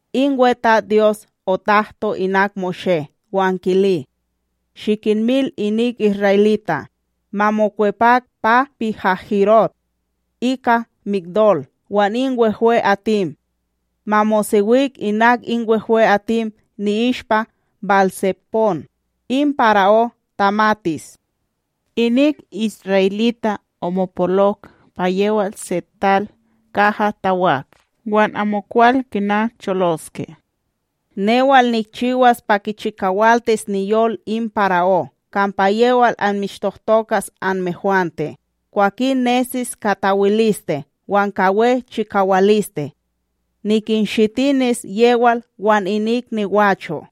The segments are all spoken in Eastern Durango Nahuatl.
In WeTatsDyos otahto inak Moshé wan kili: “Shikinmil inik isra'elita' ma mokwepak pa Pi-haHirot, ika Migdol wan in wehwe'atim. Ma mosewik inak in wehwe'atim ni'ishpa Bál-tsepón. In para'ó tamatis: ‘Inik isra'elita' omopolok pa yewal se tal kaha tawak wan amokwal kina choloske!’ Newal nikchiwas pa kichikawaltis niyol in para'ó kampa yewal anmishtohtokas anmehwante. Kwakin ninesis ka tawiliste wan ka we chikawaliste. Nikinshitinis yewal wan inik nigwacho',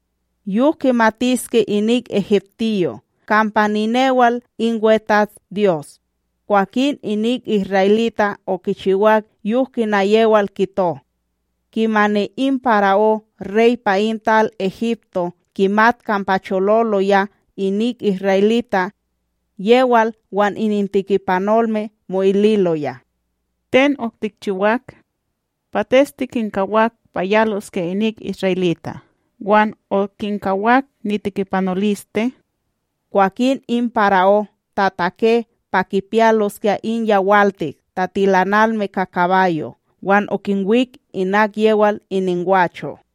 yok kimatiske inik egiptiyo' kampa ninewal in WeTatsDyos!’” Kwakin inik isra'elita' okichiwak yok kina yewal kito. Kimani in para'ó rey pa in tal Egipto kimat kampa chololoya inik isra'elita', yewal wan inintekipanolme mo'ililoya: “Ten otikchiwak! Pates tikinkawak pa yaloskya inik isra'elita' wan okinkawak nitekipanoliste?” Kwakin in para'ó tatake pa kipiyaloskya in yawaltik tatilanalme ka kabayo' wan okinwik inak yewal iningwacho'.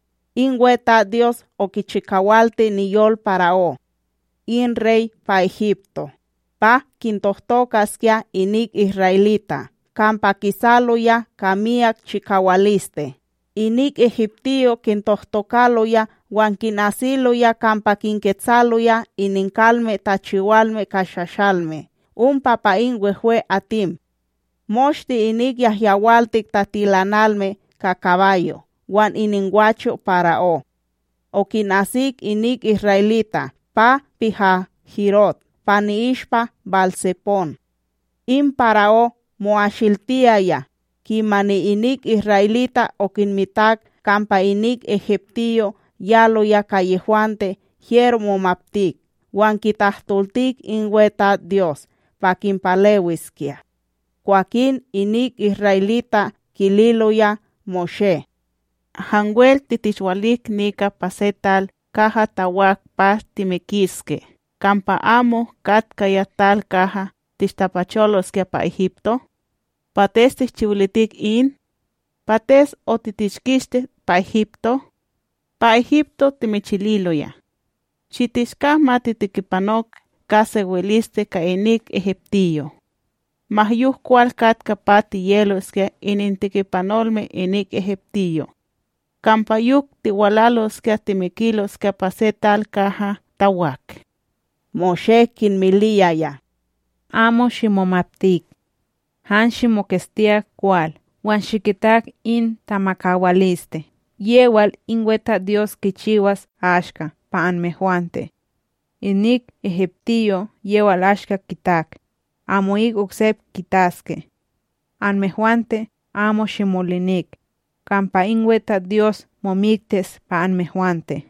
In WeTatsDyos okichikawalti niyol para'ó, in rey pa Egipto, pa kintohtokaskya inik isra'elita', kampa kisaloya ka miyak chikawaliste. Inik egiptiyo' kintohtokaloya wan kinasiloya kampa kinketsaloya ininkalme tachiwalme ka shashalme ompa pa in wehwe'atim. Moshte inik yahyawaltik tatilanalme ka kabayo' wan iningwacho' para'ó, okinasik inik isra'elita' pa Pi-haHirot pa i'ishpa Bál-tsepón. In para'ó mo'asiltitiyaya. Kimani inik isra'elita' okinmitak kampa inik egiptiyo' yaloya ka yehwante hyero momaptik wan kitahtoltik in WeTatsDyos pa kinpalewiskya. Kwakin inik isra'elita' kililoya Moshé: ―Hanwel titishwalik nika pa se tal kaha tawak pa timikiske kampa amo katkaya tal kaha tishtapacholoskya pa Egipto? Pates tishchiwilitik in? Pates otitishkisti pa Egipto? Pa Egipto timichililoya: “Shitishka ma titekipanok ka sewiliste ka inik egiptiyo'!” Ma yok kwal katka pa tiyeloskya inintekipanolme inik egiptiyo'! Kampa yok tiwalaloskya timikiloskya pa se tal kaha tawak! Moshé kinmiliyaya: ―Amo shimomaptik. Han shimoketstiyak kwal wan shikitak in tamakawaliste yewal in WeTatsDyos kichiwas ashka pa anmehwante. Inik egiptiyo' yewal ashka kitak, amo'ik oksep kitaske! Anmehwante amo shimolinik, kampa in WeTatsDyos momiktis pa anmehwante.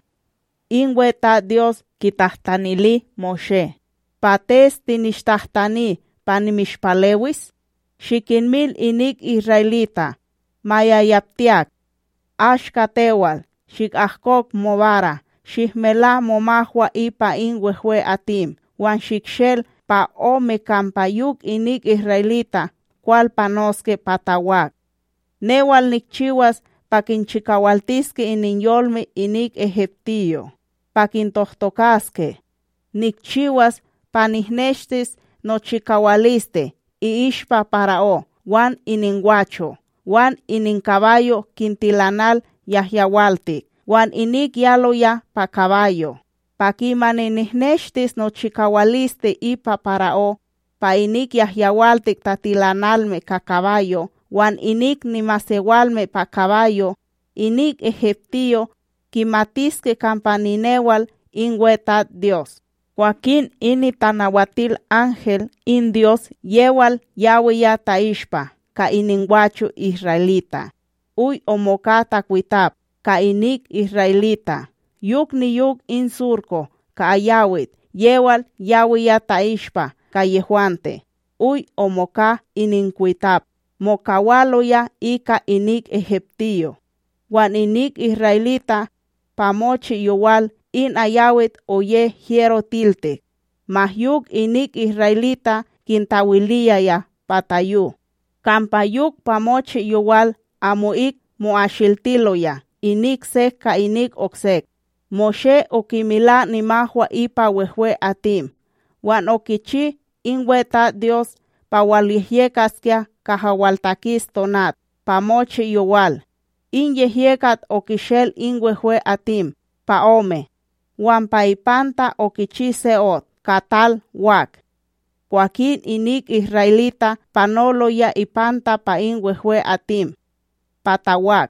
In WeTatsDyos kitahtanili Moshé: “Pates tinishtahtani pa nimishpalewis? Shikinmil inik isra'elita' ma yayaptiyak! Ashka tewal, shikahkok mobara, shihmela momahwa ipa in wehwe'atim wan shikshel pa ome kampa yok inik isra'elita' kwal panoske pa tawak. Newal nikchiwas pa kinchikawaltiske ininyolme inik egiptiyo', pa kintohtokaske, nikchiwas pa nihneshtis nochikawaliste i'ishpa para'ó wan iningwacho' wan ininkabayo' kintilanal yahyawaltik wan inik yaloya pa kabayo'! Pa kimani nihneshtis nochikawaliste ipa para'ó, pa inik yahyawaltik tatilanalme ka kabayo' wan inik nimasewalme pa kabayo', inik egiptiyo' kimatiske kampa ninewal in WeTatsDyos.” Kwakin in nitanawatilanhel in Dyos, yewal yawiya ta'ishpa ka iningwacho' isra'elita', oy omoka takwitap ka inik isra'elita', yok niyok in surko ka ayawit yewal yawiya ta'ishpa ka yehwante oy omoka ininkwitap, mokawaloya ika inik egiptiyo' wan inik isra'elita', pa mochi yowal in ayawit oye hyero tiltik, ma yok inik isra'elita' kintawiliyaya pa tayo, kampa yok, pa mochi yowal amo'ik mo'asiltiloya inik sek ka inik oksek. Moshé okimela nimahwa ipa wehwe'atim wan okichi in WeTatsDyos pa walyehyekaskya kaha waltakis tonat pa mochi yowal. In yehyekat okishel in wehwe'atim pa ome wan pa ipanta okichi se ot ka tal wak. Kwakin inik isra'elita' panoloya ipanta pa in wehwe'atim, pa tawak,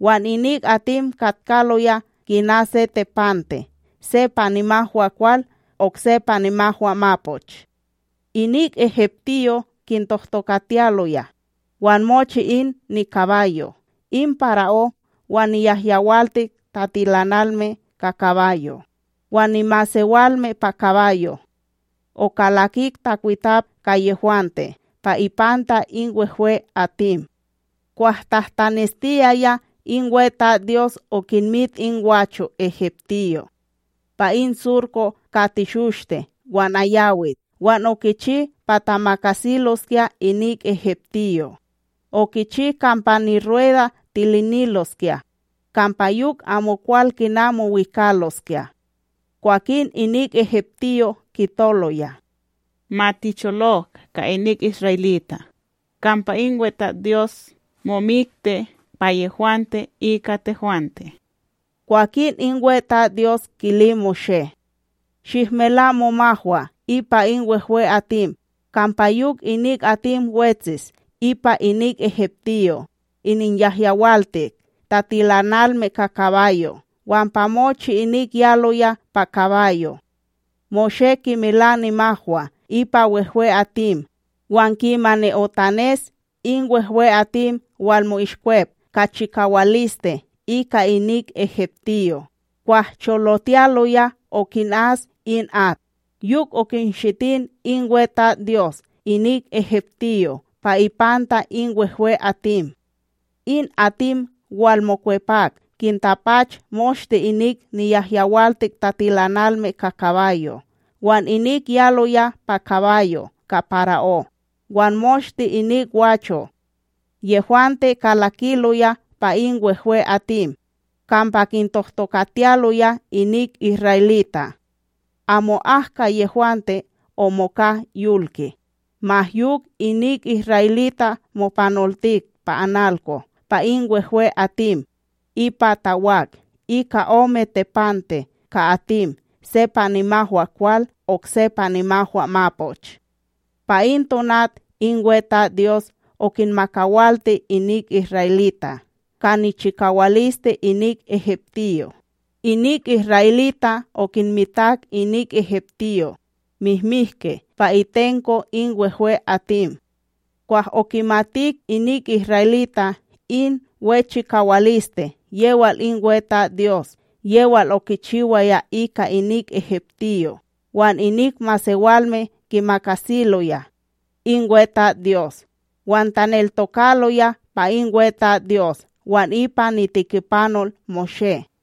wan inik atim katkaloya kina se tepante se pa nimahwaKwal okse pa nimahwaMapoch. Inik egiptiyo' kintohtokatiyaloya wan mochi in nikabayo' in para'ó wan niyahyawaltik tatilanalme ka kabayo' wan nimasewalme pa kabayo', okalakik takwitap ka yehwante pa ipanta in wehwe'atim. Kwah tahtaneshtiyaya in WeTatsDyos okinmit in gwacho' egiptiyo' pa in surko ka teshoshte wan ayawit wan okichi pa tamakasiloskya inik egiptiyo': okichi kampa nirueda tiliniloskya, kampa yok amokwal kina mowikaloskya. Kwakin inik egiptiyo' kitoloya: “Ma ticholok ka inik isra'elita', kampa in WeTatsDyos momikti pa yehwante ika tehwante!” Kwakin in WeTatsDyos kili Moshé: “Shihmela momahwa ipa in wehwe'atim, kampa yok inik atim wetsis ipa inik egiptiyo', ininyahyawaltik tatilanalme ka kabayo' wan pa mochi inik yaloya pa kabayo'.” Moshé kimela nimahwa ipa wehwe'atim wan kimani otanes in wehwe'atim walmo'ishkwep ka chikawaliste ika inik egiptiyo' kwah cholotiyaloya okinas in at. Yok okinshitin in WeTatsDyos inik egiptiyo' pa ipanta in wehwe'atim. In atim walmokwepak, kintapachok moshte inik niyahyawaltik tatilanalme ka kabayo' wan inik yaloya pa kabayo' ka para'ó, wan moshte inik gwacho' yehwante kalakiloya pa in wehwe'atim kampa kintohtokatiyaloya inik isra'elita'. Amo'ak ka yehwante omoka yolki. Ma yok inik isra'elita' mopanoltik pa analko pa in wehwe'atim ipa tawak, ika ome tepante ka atim se pa nimahwaKwal okse pa nimahwaMapoch. Pa in tonat in WeTatsDyos okinmakawalti inik isra'elita' ka nichikawaliste inik egiptiyo'. Inik isra'elita' okinmitak inik egiptiyo' mihmiki pa itenko in wehwe'atim. Wan okimatik inik isra'elita' in we chikawaliste yewal in WeTatsDyos yewal okichiwaya ika inik egiptiyo', wan inik masewalme kimakasiloya in WeTatsDyos wan taneltokaloya pa in WeTatsDyos wan ipa nitekipanol Moshé.